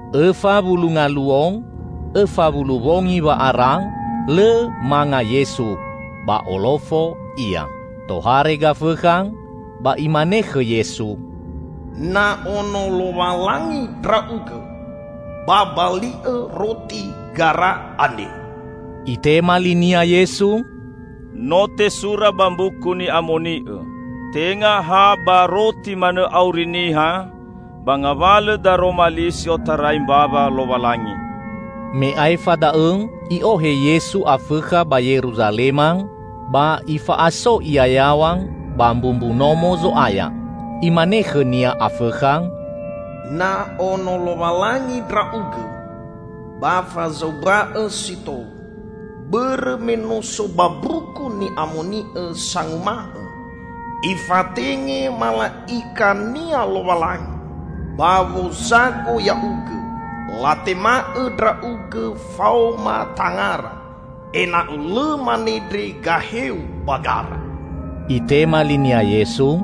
Õfa wulu ngaluo õfa wulu wongi wa'ara lõ manga Yesu. Ba olofo Ia. Tohare Gafõkha ba imane khõ Yesu, "Na Ono Lowalangi Ndra'ugõ, ba bali'õ roti gara andre." Itema linia Yesu, "No tesura ba Mbuku Ni'amoni'õ: Tenga ha ba roti manõ auri niha, ba ngawalõ daroma li si otarai mbawa Lowalangi." Me aefa da'õ, i'ohe Yesu Afõkha ba Yeruzalema ba ifa'aso Ia yaw̃a ba mbumbu Nomo Zo'aya. Imane khõ-Nia Afõkha, "Na ono Lowalangi Ndra'ugõ, ba fazaumba'Õ si tou; bõrõ me no so ba Mbuku Ni'amoni'õ sanguma'õ, 'Ifatenge mala'ika-Nia Lowalangi ba wozago Ya'ugõ, latema'õ Ndra'ugõ faoma tangara, ena'õ lõ manendre gahe-U ba gara.'" Itema linia Yesu,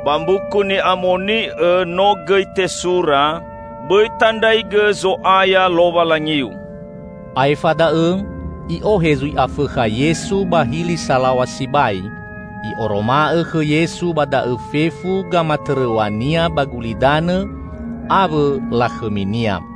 "Ba Mbuku Ni'amoni'õ no gõi tesura, 'Bõi tandraigõ Zo'aya Lowalangiu.'" Aefa da'õ, i'ohe zui Afõkha Yesu ba hili salaw̃a sibai. I'oroma'õ khõ Yesu ba da'õ fefu gamatõrõw̃a-Nia ba gulidanõ awõ lakhõminia.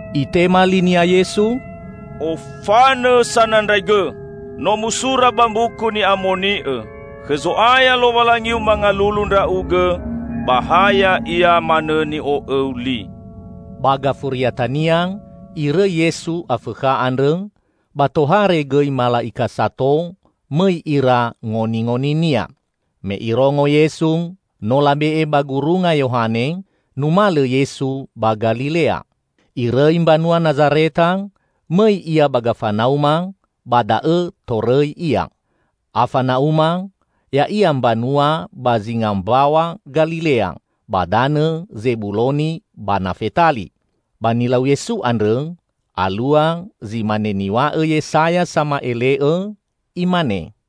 Itema linia Yesu, "Ofanõ Sanandraigõ! No musura ba Mbuku Ni'amoni'õ: Khõ Zo'aya Lowalangiu mangalulu ndra'ugõ ba ha Ya'ia manõ ni'o'õu li!" Ba gafuriatania irõi Yesu Afõkha andrõ, ba tohare gõi mala'ika sato mõi ira ngoningoni-Nia. Me Irongo Yesu no labe'e ba gurunga Yohane, numalõ Yesu ba Galilea. Irõi mbanua Nazareta, mõi Ia ba Gafana'uma. Ba da'õ torõi Ia. Afana'uma, ya'ia mbanua ba zinga Mbaw̃a Galilea ba danõ Zebuloni ba Nafetali. Ba nilau Yesu andrõ, alua zi mane niw̃a'õ Yesaya sama'ele'õ, imane: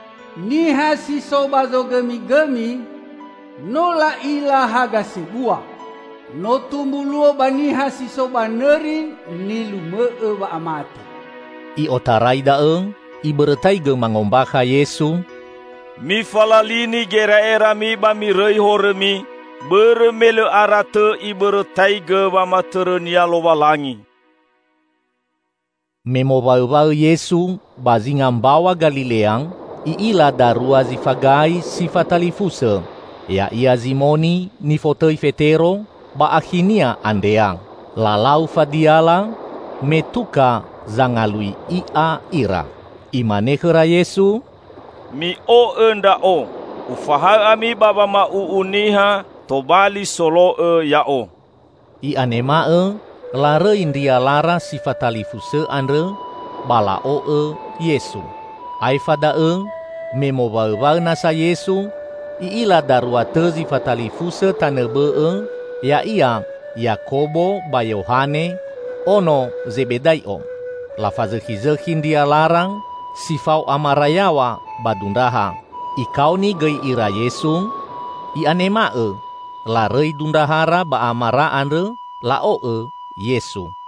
Niha si so ba zogõmigõmi, no la'ila haga sebua! No tumbu luo ba niha si so ba nõri nilumõ'õ wa'amate!" I'otarai da'õ Ibõrõtaigõ mangombakha Yesu, "Mifalalini gera'erami ba mirõi horõmi, bõrõ me lõ aratõ Ibõrõtaigõ wamatõrõ-Nia Lowalangi!" Me mowaõwaõ Yesu ba zinga mbaw̃a Galilea, I'ila darua zi fagai, si fatalifusõ, ya'ia Zimoni (nifotõi Fetero) ba akhinia, Andrea. Lalau fadiala, me tuka zangalui i'a ira. Imane khõra Yesu, "Mi'o'õ Ndra'o. Ufahaõ ami ba wama'u'u niha tobali solo'õ Ya'o." I'anema'õ larõi ndrialara si fatalifusõ andrõ ba la'o'õ Yesu. Aefa da'õ me mowaõwaõ nasa Yesu, I'ila darua tõ zi fatalifusõ tanõ bõ'õ, ya'ia Yakobo ba Yohane, ono Zebedai'o. Lafazõkhizõkhi ndrialara si fao amara yaw̃a ba dundraha. Ikaoni gõi ira Yesu, i'anema'õ larõi dundraha ba amara andrõ, la'o'õ Yesu.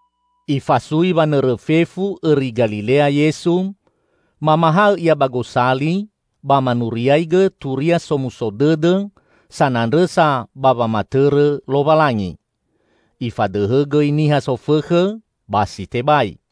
Ifasui wanõrõ fefu õri Galilea Yesu. Mamahaõ Ia ba gosali ba manuriaigõ Turia Somuso Dõdõ sanandrõsa ba wamatõrõ Lowalangi. Ifadõhõ gõi niha sofõkhõ ba si tebai.